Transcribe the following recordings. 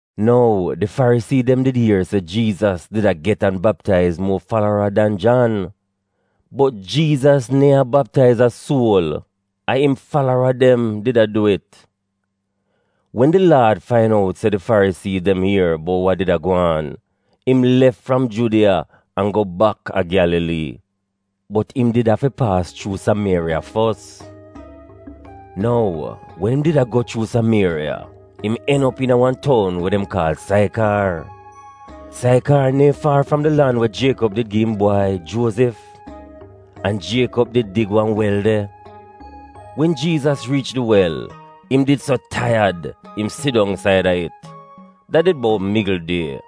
Nou, di Farisii dem did ier se Jiizas did a get an baptaiz muo falara dan Jan (bot Jiizas neehn a baptaiz a suol, a im falara dem did a du it.) Wen di Laad fain out se di Farisii dem ier bout wa did a gwaan, im lef fram Judiya an go baka Gyalalii. Bot im did afi paas chuu Samieriya fos. Nou, wen im did a go chuu Samieriya, im en op iina wan toun we dem kaal Saikaar. Saikaar neehn faar fram di lan we Jiekob did gi im bwai, Juozif, an Jiekob did dig wan wel de. Wen Jiizas riich di wel, im did so taiyad im sit dong saida it. Dat did bout migl die.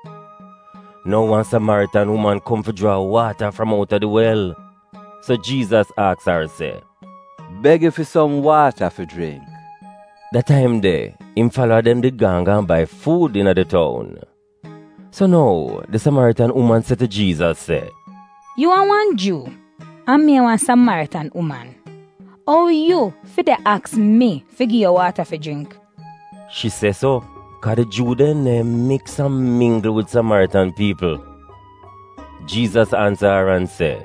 Nou, wan Samaritan uman kom fi jraa waata fram outa di wel. So Jiizas aks ar se, “Beg yu fi som waata fi jringk?” (Da taim de, im falara dem did gaan gaan bai fuud iina di toun.) So nou, di Samaritan uman se tu Jiizas se, “Yu a wan Juu an mi a wan Samaritan uman. Ou yu fi de aks mi fi gi yu waata fi jringk?” (Shi se so, kaa di Juu dem neehn miks an minggl wid Samaritan piipl.) Jiizas ansa ar an se,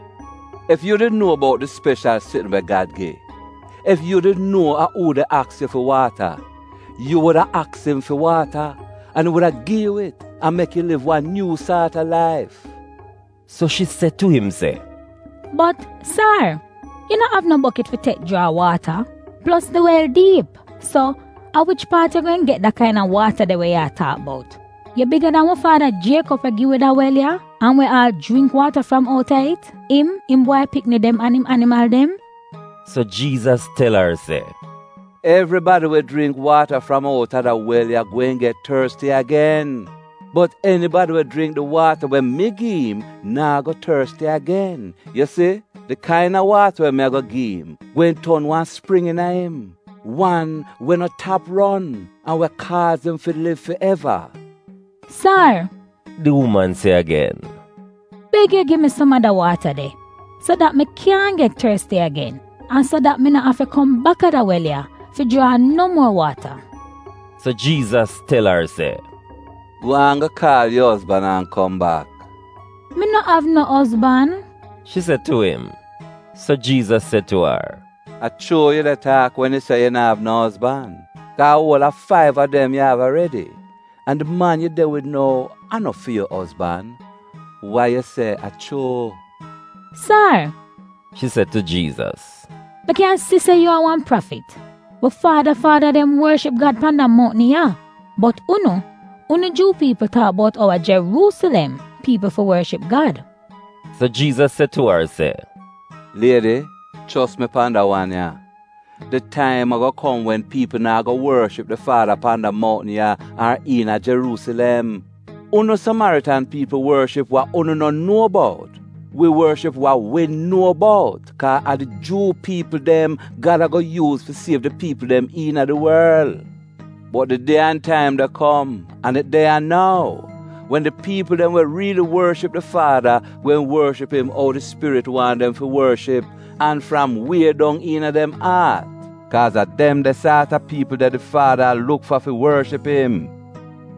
“Ef yu did nuo bout di speshal sitn we Gad gi — Ef yu did nuo a uu de aks yu fi waata, yu wuda aks im fi yu waata, an im wuda gi yu it an mek yu liv wan nyuu saat a laif.” So shi se tu im se, “Bot, sar, yu no av no bokit fi tek jraa waata, plos di wel diip. So, a wich paat yu gweehn get da kaina waata de we yu a taak bout? Yu biga dan wi faada Jiekob we gi wi da wel ya, an we aal jringk waata fram outa it — im, im Bwai Pikni dem an im animal dem?” So, Jiizas tel ar se, “Evribadi we jringk waata fram outa da wel ya gweehn get torsti agen, bot enibadi we jringk di waata we mi gi'im naa go torsti agen. Yu si, di kaina waata we mi ago gi'im gweehn ton wan spring iina im, wan we no tap ron, an we kaaz im fi liv fi eva.” “Sar,” di uman se agen, “beg yu gi mi som a da waata de, so dat mi kyaahn get torsti agen, an so dat mi no afi kom baka da wel ya fi jraa no muo waata!” So Jiizas tel ar se, “Gwaan go kaal yu ozban an kom bak.” “Mi no av no ozban,” shi se tu im. So Jiizas se tu ar se, “A chuu yu de taak wen yu se yu na'av no ozban. Kaa a uol a faiv a dem yu av aredi, an di man yu de wid nou a no fi yu ozban. Wa yu se a chuu.” “Sar,” shi se tu Jiizas, “a kyan si se yu a wan prafit. Wi faada faada dem worship Gad pan da mountn ya, bot unu, unu Juu piipl taak bout ou a Jeruusilem piipl fi worship Gad.” So, Jiizas se tu ar se, “Liedi, chos mi pan da wan ya: di taim ago kom wen piipl naa go worship di Faada pan da mountn ya ar iina Jeruusilem. Unu Samaritan piipl worship wa unu no nuo bout. Wi worship wa wi nuo bout, kaa a di Juu piipl dem Gad ago yuuz fi siev di piipl dem iina di worl. Bot di die an taim de kom — an it de ya nou — wen di piipl dem we riili worship di Faada gweehn worship im ou di Spirit waahn dem fi worship an fram wie dong iina dem aat. Kaaz a dem de saat a piipl de di Faada a luk fa fi worship im.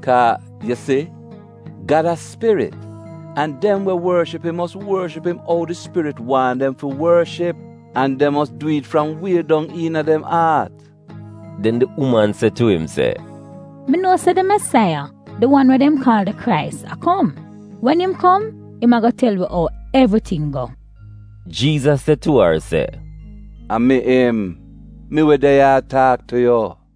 Kaa, yu si, Gad a spirit an dem we worship im mos worship im ou di Spirit waahn dem fi worship an dem mos dwi'it fram wie dong iina dem aat.” Den di uman se tu im se, “Mi nuo se di Mesaiya, di wan we dem kaal di Krais, a kom. Wen im kom, im ago tel wi ou evriting go.” Jiizas se tu ar se, “A mi im — mi we de ya a taak tu yu.”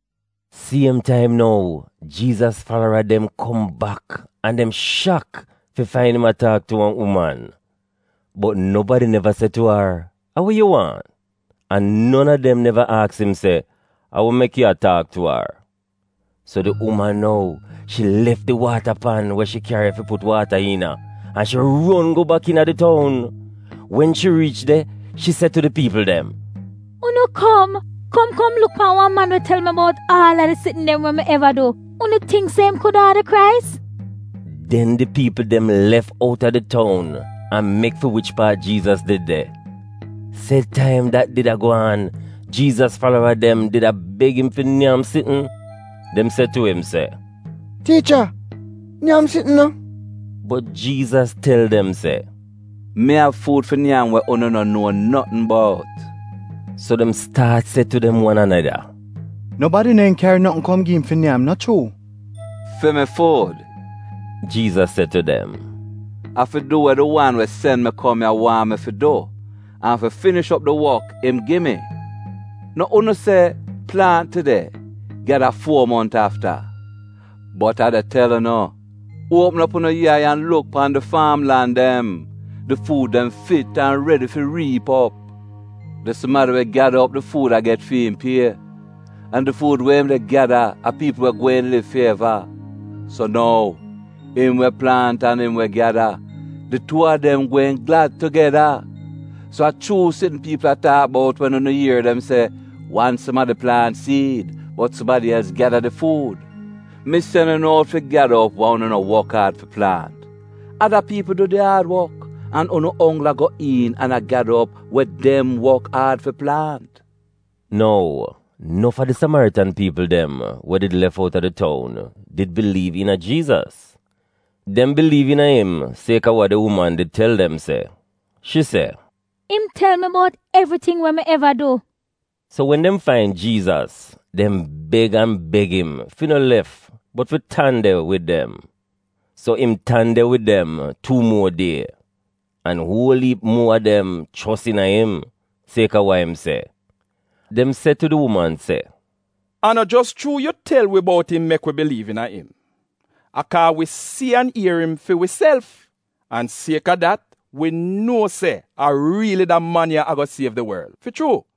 Siem taim nou, Jiizas falara dem kom bak an dem shak fi fain im a taak tu wan uman. Bot nobadi neva se tu ar, “A wa yu waahn?” an non a dem neva aks im se, “A wa mek yu a taak tu ar?” So di uman nou, shi lef di waata pan we shi kyari fi put waata iina, an shi ron go bak iina di toun. Wen shi riich de shi se tu di piipl dem, “Unu kom, kom kom luk pan wan man we tel mi bout aal a di sitn dem mi eva du. Unu tingk se im kuda a di Krais?” Den di piipl dem lef outa di toun an mek fi wich paat Jiizas did de. Sed taim dat did a gwaan, Jiizas falara dem did a beg im fi nyam sitn. Dem se tu im se, “Tiicha, nyam sitn no!” Bot Jiizas tel dem se, “Mi av fuud fi nyam we unu no nuo notn bout.” So dem staat se tu dem wan aneda, “Nobadi neehn kyari notn kom gi'im fi nyam, no chuu?” “Fi mi fuud,” Jiizas se tu dem, “a fi du we di wan we sen mi kom ya waahn mi fi du, an fi finish op di wok im gi mi. No unu se, ‘Plaant tide, gyada fuo mont afta’? Bot a de tel unu, uopm op unu yai an luk pan di faam lan dem! Di fuud dem fit an redi fi riip op! Di sumadi we gyada op di fuud a get fi'im pie, an di fuud we im de gyada a piipl we gweehn liv fi eva. So nou, im we plaant an im we gyada, di tuu a dem gweehn glad tugeda. So a chuu sitn piipl a taak bout wen unu ier dem se, ‘Wan sumadi plaant siid, bot sumadi els gyada di fuud.’ Mi sen unu out fi gyada op wa unu no wok aad fi plaant. Ada piipl du di aad wok, an unu onggl a go iin an a gyada op wa dem wok aad fi plaant.” Nou, nof a di Samaritan piipl dem we did lef outa di toun did biliiv iina Jiizas. Dem biliiv iina im sieka wa di uman did tel dem se. Shi se, “Im tel mi bout evriting we mi eva du.” So, wen dem fain Jiizas, dem beg an beg im fi no lef bot fi tan de wid dem. So im tan de wid dem tuu muo die, an uol iip muo a dem chos iina im, sieka wa im se. Dem se tu di uman se, “A no jos chuu yu tel wi bout im mek wi biliiv iina im. A kaa wi si an ier im fi wiself, an sieka dat wi nuo se a riili da man ya ago siev di worl, fi chuu.”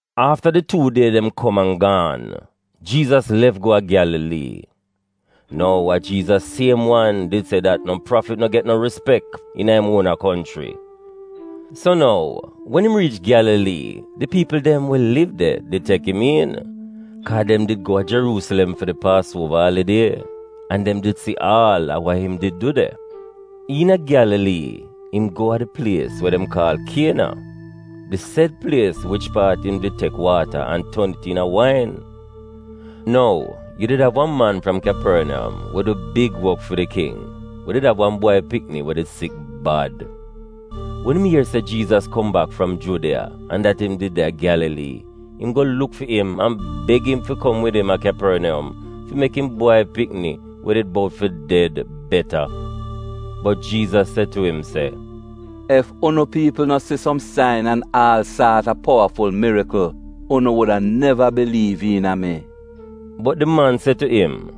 Afta di tuu die dem kom an gaan, Jiizas lef go a Gyalalii. (Nou, a Jiizas siem wan did se dat no prafit no get no rispek iina im uona konchri.) So nou, wen im riich Gyalalii di piipl dem we liv de did tek im iin, kaa dem did go a Jeruusilem fi di Paasuova alidie an dem did si aal a wa im did du de. Iina Gyalalii, im go a di plies we dem kaal Kiena — di sed plies wich paat im did tek waata an ton it iina wain. Nou, yu did av wan man fram Kyaporniyom we du big wok fi di king, we did av wan bwai pikni we did sik bad. Wen im ier se Jiizas kom bak fram Judiya an dat im did de a Gyalalii, im go luk fi im an beg im fi kom wid im a Kyaporniyom fi mek im bwai pikni, we did bout fi ded, beta. Bot Jiizas se tu im se, “Ef unu piipl no si som sain an aal saat a powaful mirikl, unu wuda neva biliiv iina mi.” Bot di man se tu im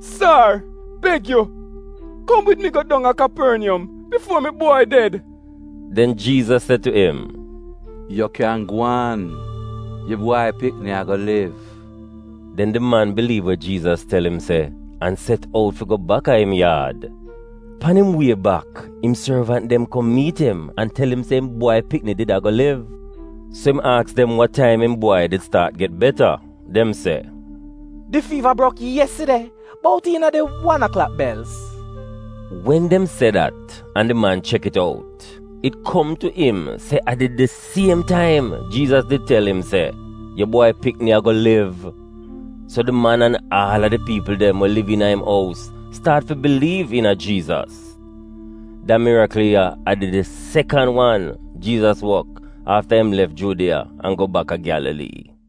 se, “Sar, beg yu kom wid mi go dong a Kyaporniyom bifuo mi bwai ded.” Den Jiizas se tu im, “Yu kyan gwaan. Yu bwai pikni ago liv.” Den di man biliiv we Jiizas tel im se, an set out fi go baka im yaad. Pan im wie bak, im sorvant dem kom miit im an tel im se im bwai pikni did ago liv So im aks dem wa taim im bwai did staat get beta. Dem se, “Di fiiva brok yeside, bout iina di wan aklak belz.” Wen dem se dat an di man chek it out, it kom tu im se a did di siem taim Jiizas did tel im se, “Yu bwai pikni ago liv.” So di man an aal a di piipl dem we liv iina im ous staat fi biliiv iina Jiizas. Da mirikl ya a did di sekan wan Jiizas wok afta im lef Judiya an go baka Gyalalii.